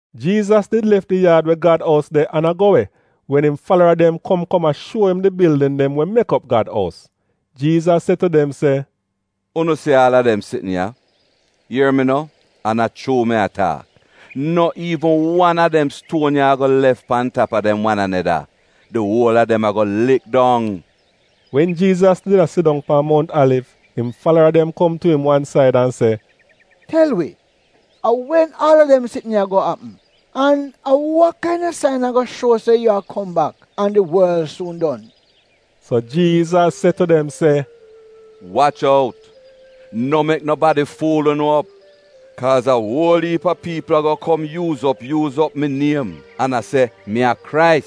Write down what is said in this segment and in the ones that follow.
Jiizas did lef di yaad we Gad ous de an a go we, wen im falara dem kom kom a shuo im di bildin dem we mek op Gad ous. Jiizas se tu dem se, “Unu si aal a dem sitn ya? Ier mi no, an a chuu mi a taak, no iivn wan a dem stuon ya ago lef pan tap a dem wan aneda. Di uol a dem ago lik dong!” Wen Jiizas did a sidong pan Mount Aliv im falara dem kom tu im wan said an se, “Tel wi, a wen aal dem sitn ya ago apm? An a wa kaina sain ago shuo se yu a kom bak an di worl suun don?” So Jiizas se tu dem se, “Wach out, no mek nobadi fuul unu op. Kaaz a uol iip a piipl ago kom yuuz op yuuz op mi niem, an a se, ‘Mi a Krais,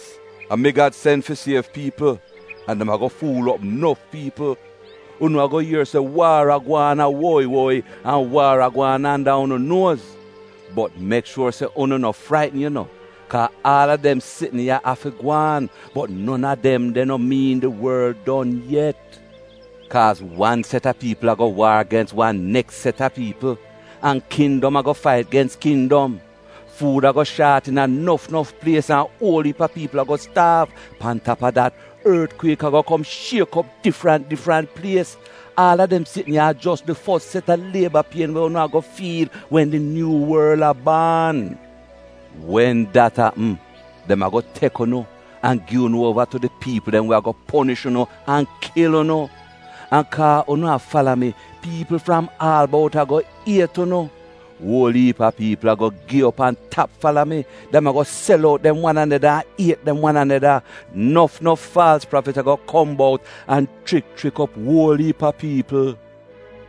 a mi Gad sen fi siev piipl,’ an dem ago fuul op nof piipl. Unu ago ier se waar a gwaan a woyi woyi an waar a gwaan anda unu nuoz. Bot mek shuor se unu no fraitn yu no, kaa aal a dem sitn ya afi gwaan, bot non a dem de no miin di worl don yet. Kaaz wan set a piipl ago waar gens wan neks set a piipl, an kindom ago fait gens kindom. Fuud ago shaat iina nof nof plies an uol iip a piipl ago staav, pan tap a dat ortkwiek ago kom shiek op difrant difrant plies. Aal a dem sitn ya a jos di fos set a lieba pien we unu ago fiil wen di nyuu worl a baan. Wen dat apm, dem ago tek unu, an gi unu uova tu di piipl dem we ago ponish unu an kil unu. An kaa unu a fala mi, piipl fram aal bout ago iet unu. Uol iip a piipl ago gi op an tap fala mi. Dem ago sel out dem wan aneda an iet dem wan aneda. Nof nof faalz prafit ago kom bout an chrik chrik op uol iip a piipl,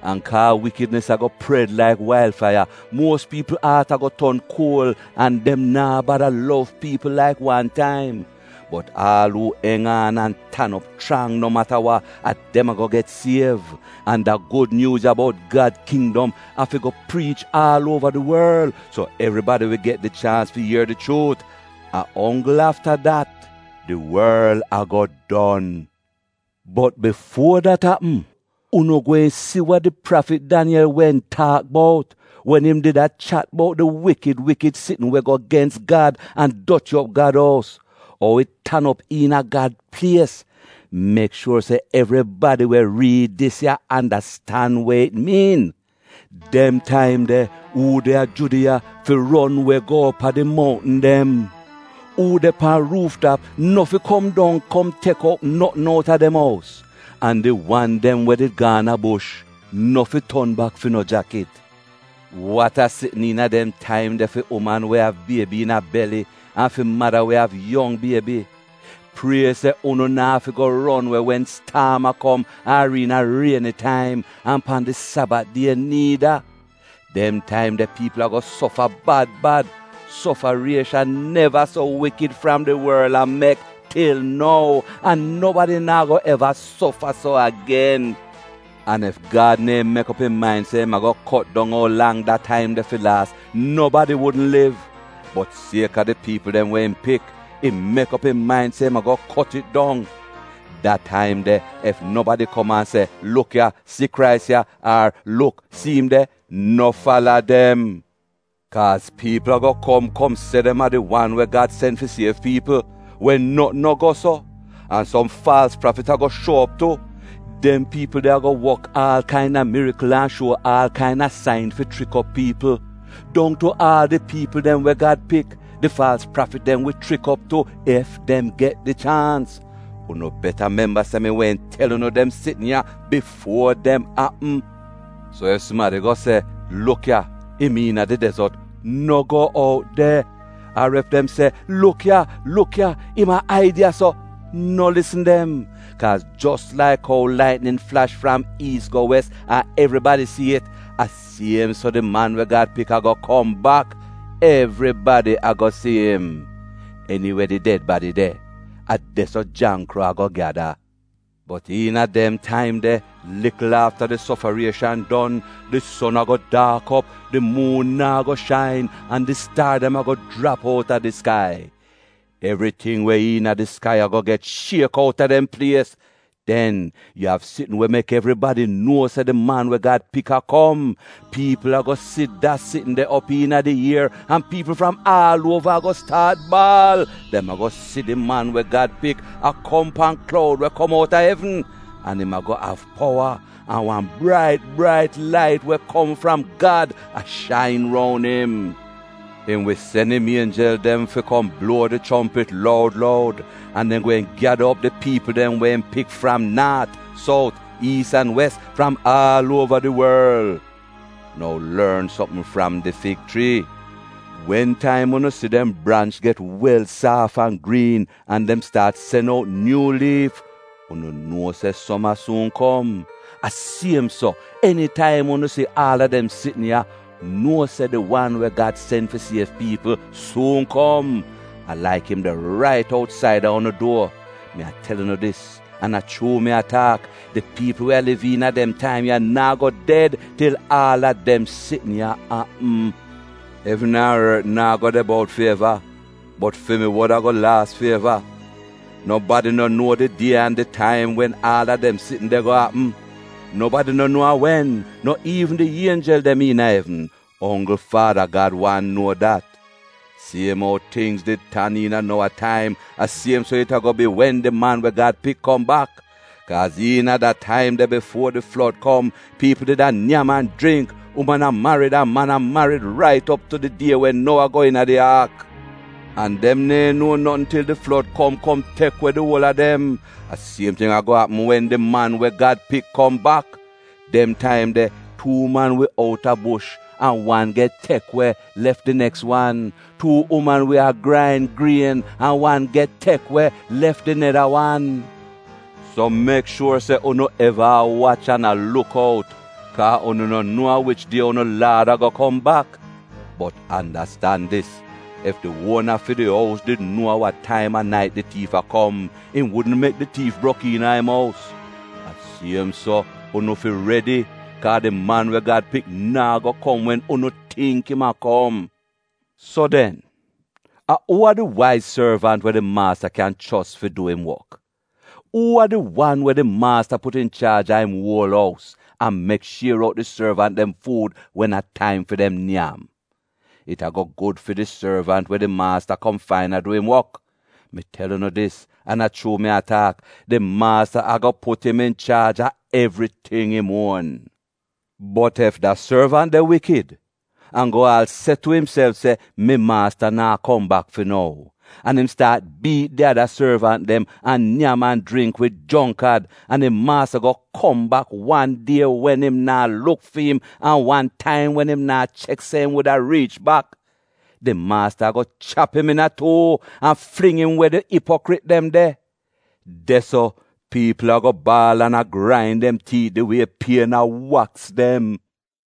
An kaa wikidnis ago pred laik wail faiya, muos piipl aat ago ton kuol an dem naa bada lov piipl laik wan taim. Bot aal uu eng aan an tan op chrang no mata wa, a dem ago get siev. An da Gud Nyuuz ya bout Gad Kindom ago afi priich aal uova di worl. So evribadi wi get di chaans fi ier di chuut. A onggl afta dat, di worl ago don. “Bot bifuo dat apm, unu gweehn si wa di prafit Daniyel wehn taak bout, wen im did a chat bout di ‘wikid wikid sitn we go gens Gad an doti op Gad ous,’ ou it tan op iina Gad plies (mek shuor se evribadi we riid dis ya andastan we it miin). Dem taim de, uu de a Judiya fi ron we go op a di mountn dem. Uu de pan ruuf tap, no fi kom dong kom tek out notn out a dem ous. An di wan dem we did gaan a bush, no fi ton bak fi no jakit. Wat a sitn iina dem taim de fi uman we av biebi iina beli an fi mada we av yong biebi! Prie se unu na'afi go ron we wen staam a kom ar iina rieni taim, an pan di Sabat die niida. Dem taim de piipl ago sofa bad bad. Sofariehsan neva so wikid fram di worl a mek til nou, an nobadi naa go eva sofa so agen. An ef Gad neehn mek op im main se im a kot dong ou lang da taim de fi laas, nobadi wudn liv. Bot sieka di piipl dem we im pik, im mek op im main se im ago kot it dong. Da taim de, ef nobadi kom an a se, “Luk ya, si Krais ya!” ar “Luk! Si im de!” No fala dem. Kaaz piipl ago kom kom se dem a di wan we Gad sen fi siev piipl, wen notn no go so. An som faalz prafit ago shuo op tu. Dem piipl de ago wok aal kaina mirikl an shuo aal kaina sain fi chrik op piipl, dong tu aal di piipl dem we Gad pik, di faalz prafit dem wi chrik op tu ef dem get di chaans. Unu beta memba se mi wehn tel unu dem sitn ya bifuo dem apm. “So ef sumadi go se, ‘Luk ya, im iina di dezot.’ No go out de. Ar ef dem se, ‘Luk ya! luk ya! Im a aid ya-so!’ No lisn dem. Kaaz jos laik ou laitnin flash fram iis go wes an evribadi si it, a siem so di Man we Gad Pik ago kom bak — evribadi ago si im. Eniwe di ded badi de, a de-so jangkro ago gyada. “Bot iina dem taim de, likl afta di sofarieshan don, “Di son ago daak op, di muun naa go shain an di staar dem ago jrap outa di skai. Evriting we iina di skai ago get shiek outa dem plies. “Den, yu av sitn we mek evribadi nuo se di Man we Gad Pik a kom, piipl ago si da sitn de op iina di ier, an piipl fram aal uova ago staat baal. Dem ago si di Man we Gad Pik a kom pan kloud we kom outa evn, an im ago av powa, an wan brait brait lait we kom fram Gad a shain roun im. Im wi sen im ienjel dem fi kom bluo di chompit loud loud, an dem gweehn gyada op di piipl dem we im pik fram naat, sout, iis an wes, fram aal uova di worl. “Nou lorn sopm fram di fig chrii: Wen taim unu si dem branch get wel saaf an griin, an dem staat sen out nyuu liif, unu nuo se soma suun kom. A siem so, enitaim unu si aal a dem sitn ya, nuo se di wan we Gad sen fi siev piipl suun kom; a laik im de rait outsaida unu duor. Mi a tel unu dis an a chuu mi a taak, di piipl we a liv iina dem taim ya naa go ded til aal a dem sitn ya apm. Evn an ort naa go de bout fi eva, bot fi mi wod ago laas fi eva. “Nobadi no nuo di die an di taim wen aal a dem sitn de ago apm, nobadi no nuo a wen, no iivn di ienjel dem iina evn — onggl Faada Gad wan nuo dat. Siem ou tingz did tan iina Nowa taim, a siem so it ago bi wen di Man we Gad Pik kom bak. Kaaz iina da taim de bifuo di flod kom, piipl did a nyam an jringk, uman a marid an man a marid rait op tu di die wen Nowa go iina di aak. An dem neehn nuo notn til di flod kom kom tek we di uol a dem. A siem ting ago apm wen di Man we Gad Pik kom bak. Dem taim de, tuu man wi out a bush an wan get tek we, lef di neks wan. Tuu uman wi a grain grien an wan get tek we lef di neda wan. “So mek shuor se unu eva a wach an a luk out, kaa unu no nuo a wich die unu Laad ago kom bak. Bot andastan dis: Ef di uona fi di ous did nuo a wa taim a nait di tiif a kom, im wudn mek di tiif brok iina im ous. A siem so unu fi redi, kaa di Man we Gad Pik naa go kom wen unu tingk im a kom.” “So den, a uu a di waiz sorvant we di maasta kyan chos fi dwi'im wok? Uu a di wan we di maasta put inchaaj a im uol ous, an mek shier out di sorvant dem fuud wen a taim fi dem nyam? It ago gud fi di sorvant we di maasta kom fain a du im wok. Mi tel unu dis, an a chuu mi a taak, di maasta ago put im inchaaj a evriting im uon. Bot ef da sorvant de wikid an go aal se tu imself se, ‘Mi maasta naa kom bak fi nou.’ An im staat biit di ada sorvant dem, an nyam an jringk wid jongkad, an im maasta go kom bak wan die wen im naa luk fi im an wan taim wen im naa chek se im wuda riich bak. Di maasta ago chap im iina tuu an fling im we di ipokrit dem de. De-so piipl ago baal an a grain dem tiit di wie pien a waks dem.”